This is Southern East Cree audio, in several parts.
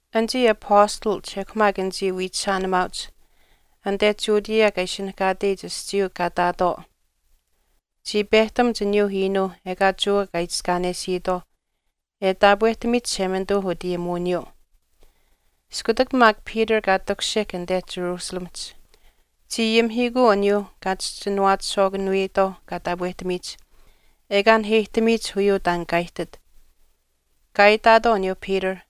Anichii apastalach ekw maak anichii wiichishaanimaauch anite Judea kaa ishinihkaatech aschiiyuu kaa ihtaatwaau chii pehtamuch aniyuu iinuu ekaa Jewa kaa itiskaanesiitwaauh e taapwehtamiyich Chishemanituu utayimuwiniyuu. Iskutak maak Peter kaa takushihk anite Jerusalemihch, chii ayimihiikuu aniyuuh kaa chischinuwaachishwaakanuyitwaau kaa taapwehtamiyich ekaa naheyihtamiyich uyuu taan kaa ihtit. Kaa itaatwaau aniyuu Peter,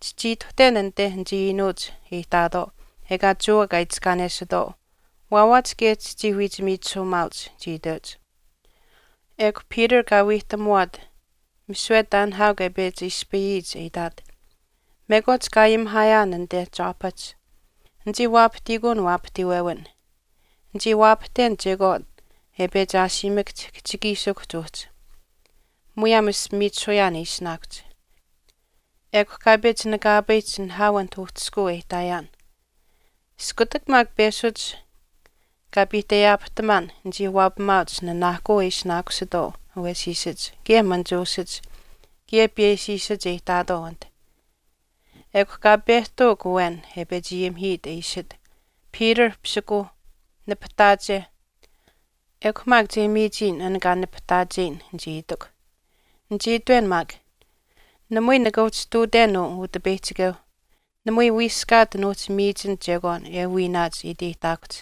“Chichii ituhten anite anichii iinuuch e ihtaatwaau ekaa Jewa kaa itiskaanesitwaau, waawaach kaye chichii wiichimiichisuumaauch,” chii iteuch. Ekw Peter kaa wiihtamuwaat misiwe taan nihaau kaa pechi ispayiyich e itaat, “Mekwaach kaa ayimihaayaan anite Joppahch, nichii waapahtiikuun waapahtiiwewin. Nichii waapahten chekwaan e pechi ashiimakahch kihchikiishikuhch uhchi, muyaam ashpimiichisuyaan e ishinaakuhch. Ekw kaa pechi nakaapayihch nihaau anit uhchishkuu e ihtaayaan. Iskutak maak peshuch kaa piihteyaapahtamaan nichii waapamaauch nanaahkuu e ishinaakusitwaau awesiisach kaye manichuushach kaye piyeshiishach e ihtaatwaau anit. Ekw kaa pehtuuk awen e pechi ayimihiit e iishit, ‘Peter pisikuuh, nipahtaache ekw maak che miichiyin an kaa nipahtaayin,’ nichii itikw. Nichii itwen maak, ‘Namui nika uhchi ihtuuten uu Utipeyihchikeu, namui wiiskaat nuuhchi miichin chekwaan e wiinaach e iteyihtaakuhch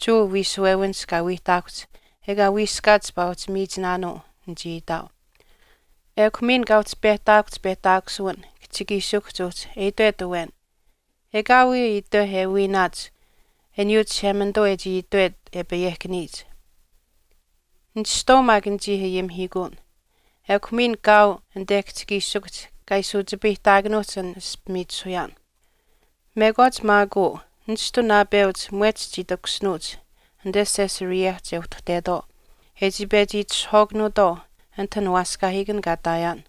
Jewa wiishuwewinihch kaa wiihtaakuhch ekaa wiiskaat chipaa uhchi miichinaanuu,’ nichii itaau. Ekw miin kaa uhchi pehtaakuhch pehtaakusuwin kihchikiishikuhch uhchi e itwet awen, ‘Ekaawii itweh e wiinaach aniyuu Chishemanituu e chii itwet e payehkaniyich.’ Nishtwaau maak nichii ayimihiikuun, ekw miin kaau anite kihchikiishikuhch kaa ishi uchipayihtaakanuuhch an ashpimiichisuyaan.” “Mekwaach maak uu nishtu naapeuch mwehch chii takushinuuch anite Caesareahch e uhtuhtetwaau e chii pechi itishahwaakanuutwaau anit an waaskaahiikan kaa ihtaayaan.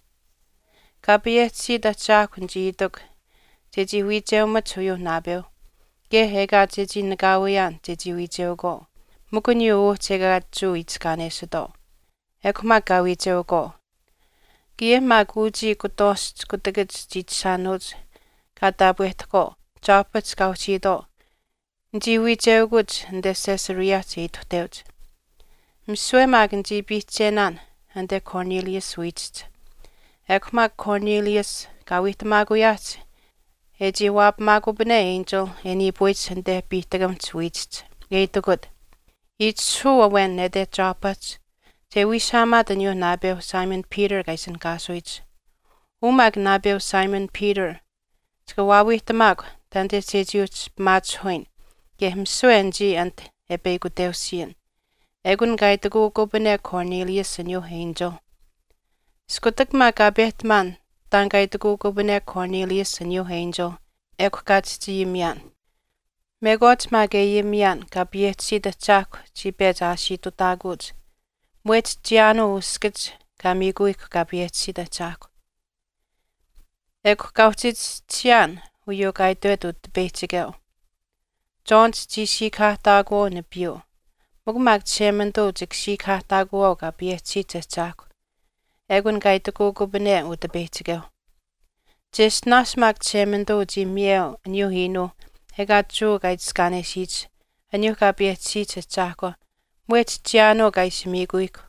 Kaa payehchisiit Ahchaahkw nichii itikw chechii wiicheumach uyuu naapeu kaye ekaa chechii nakaawiyaan chechii wiicheukwaau mikw aniyuu uhchi ekaa Jewa itiskaanesitwaau. Ekw maak kaa wiicheukwaau. Kaye maak kaye uchii kutwaashch kutakach chiichishaanuuch kaa taapwehtahkwaau Joppahch kaa uhchiitwaau nichii wiicheukuch anite Caesareahch e ituhteuch. Misiwe maak nichii piihchenaan anite Cornelius wiichihch. Ekw maak Cornelius kaa wiihtamaakuyaahch e chii waapamaakupane enchil e niipuyich anite piihtakamihch wiichihch e itikut, ‘Itishahuu awen nete Joppahch che wiishaamaat aniyuu naapeuh Simon Peter kaa ishinihkaasuyich. Uu maak naapeu Simon Peter chika waawiihtamaakw taanite chechii uhchi pimaachihuyin kaye misiwe anichii anit e peyakuteusiyin,’ ekun kaa itikuukupane Cornelius aniyuu enchil. Iskutak maak kaa pehtamaan taan kaa itikuukupane Cornelius aniyuu enchil, ekw kaa chihchi ayimiyaan. Mekwaach maak e ayimiyaan Kaa payehchisiyich Ahchaahkw chii pechi aashiitutaakuuch mwehch chiyaanuu uskach kaa miikuyihkw Kaa payehchisiit Ahchaahkw. Ekw kaa uhchi chischisiyaan uyuu kaa itwet Utipeyihchikeu, ‘John chichii siikahaahtaakuwaau nipiiyuu, mikw maak Chishemanituu chika siikahaahtaakuwaau Kaa payehchisiyich Ahchaahkwa,’ ekun kaa itwekupane Utipeyihchikeu. Cheshtinaash maak Chishemanituu chii miyeu aniyuu iinuuh ekaa Jewa kaa itiskaanesiyich aniyuuh kaa payehchisiyich ahchaahkwa mwehch chiyaanuu kaa ishi miikuyihkw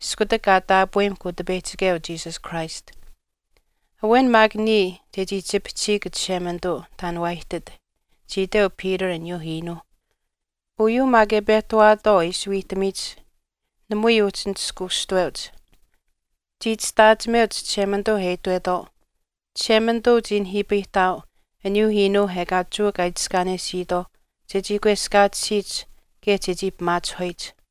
iskutak kaa taapweyimahkw Utipeyihchikeu Jesus Christ. Awen maak niya chechii chipihchihiik Chishemanituu taan waa ihtit,” chii iteu Peter aniyuu iinuu. Uyuu maak e pehtawaatwaau e ishi wiihtamiyich namui uhchii nishkuushtuweuch. Chii chishtaachimeuch Chishemanituu e itwetwaau, “Chishemanituu chii nihiipayihtaau aniyuu iinuu ekaa Jewa kaa itiskaanesiitwaauh chechii kweskaatisiyich kaye chechii pimaachihuyich.”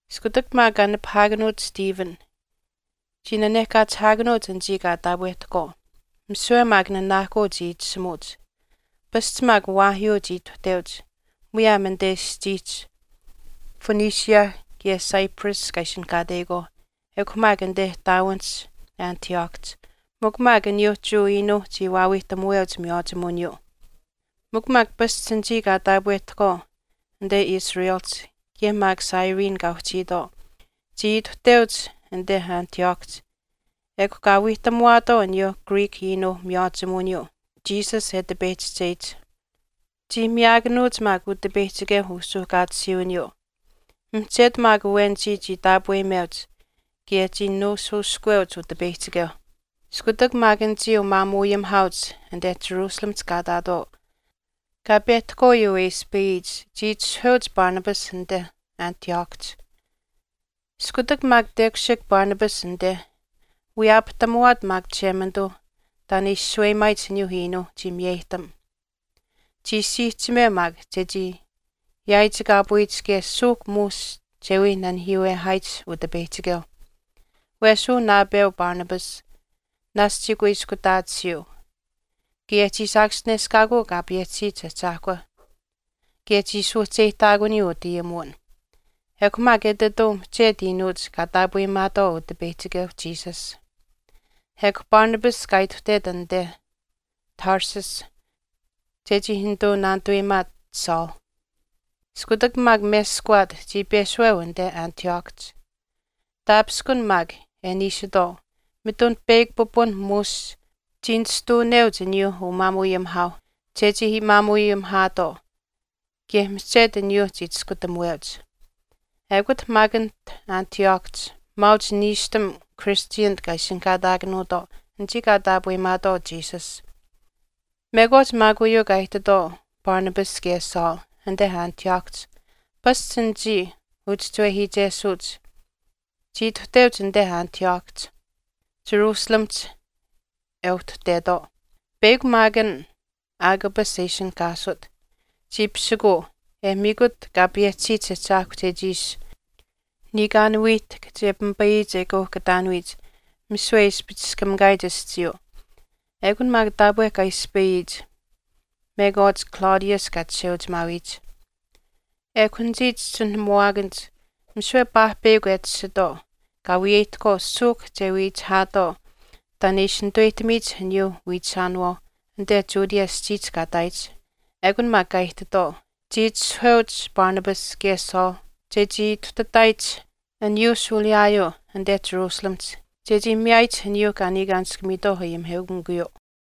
Iskutak maak kaa nipahaakanuut Stephen, chii nanehkaachihaakanuuch anichii kaa taapwehtahkwaau, misiwe maak nanaahkuu chii itishimuuch. Pasch maak waahyuu chii ituhteuch muyaam anite aschiihch Phoenicia kaye Cyprus kaa ishinihkaateyikwaauh ekw maak anite ihtaawinihch Antioch, mikw maak aniyuu Jewa iinuuh chii waawiihtamuweuch miywaachimuwiniyuu. Mikw maak pasch anichii kaa taapwehtahkwaau anite Cyprus, kaye maak Cyrene kaa uhchiitwaau chii ituhteuch anite Antiochihch ekw kaa wiihtamuwaatwaau aniyuu Greek iinuu miywaachimuwiniyuu Jesus e tipeyihchicheyich. Chii miyaakanuuch maak Utipeyihchikeu usuuhkaatisiiwiniyuu, mihchetu maak awenichii chii taapweyimeuch kaye chii nuushuushkuweuch Utipeyihchikeu. Iskutak anichii umaamuuayimihaauch anite Jerusalemihch kaa ihtaatwaau kaa pehtahkwaau uyuu e ispayiyich chii itishahuweuch Barnabas anite Antiochihch. Iskutak maak tekushihk Barnabas anite, wiyaapahtamuwaat maak Chishemanituu taan e ishi shaweyimaayich aniyuu iinuu, chii miyeyihtam. Chii siihchimeu maak chechii yaaichikaapuyich kaye suuhk muush che wii nanihiiwehaayich Utipeyihchikeu. Wesh uu naapeu Barnabas naashch chii kuiskutaatisiyuu, kaye chii saakaschineshkaakuu Kaa payehchisiyich Ahchaahkwa, kaye chii suuhcheyihtaakuniyuu utaapwehtamuwin. Ekw maak etituu mihchetu iinuuch kaa taapweyimaatwaau Utipeyihchikeu Jesus. Ekw Barnabas kaa ituhtet anite Tarsus chechii nituu naanituweyimaat Saul. Iskutak maak meskawaat, chii peshuweu anite Antiochihch. Taapishkun maak e niishitwaau mitun peyakw pipun muush chii nishtuuneuch aniyuu umaamuuayimihaauh chechii maamuu ayimihaatwaau kaye mihchetu aniyuu chii chiskutamuweuch. Ekut maak anit Antiochihch maauch niishtam Christianich kaa ishinihkaataakanuutwaau anichii kaa taapweyimaatwaau Jesus. Mekwaach maak uyuu kaa ihtitwaau Barnabas kaye Saul anite Antiochihch, pasch anichii uchischiwehiichesuuch chii ituhteuch anite Antiochihch, Jerusalemihch e uhtuhtetwaau. Peyakw maak an Agabus e ishinihkaasut, chii pisikuu e miikut Kaa payehchisiyich Ahchaahkwa chechii ishi niikaan wiihtahk che pimipayiyich e kauhkataanuyich misiwe e ispichiskamikaayich aschiiyuu. Ekun maak taapwe kaa ispayiyich mekwaach Claudius kaa chisheuchimaawiyich. Ekw anichii chischinuhamuwaakanich misiwe paahpeyakw e tashitwaau kaa wiyeyihtahkwaau suuhk che wiichihaatwaau taan e ishi nituweyihtamiyich aniyuu wiichishaanawaau anite Judea aschiihch kaa ihtaayich. Ekun maak kaa ihtitwaau. Chii itishahuweuch Barnabas kaye Saul chechii ituhtataayich aniyuu shuuliyaayuu anite Jerusalemihch chechii miyaayich aniyuuh kaa niikaanishkamiitwaau ayimiheukamikuyuu.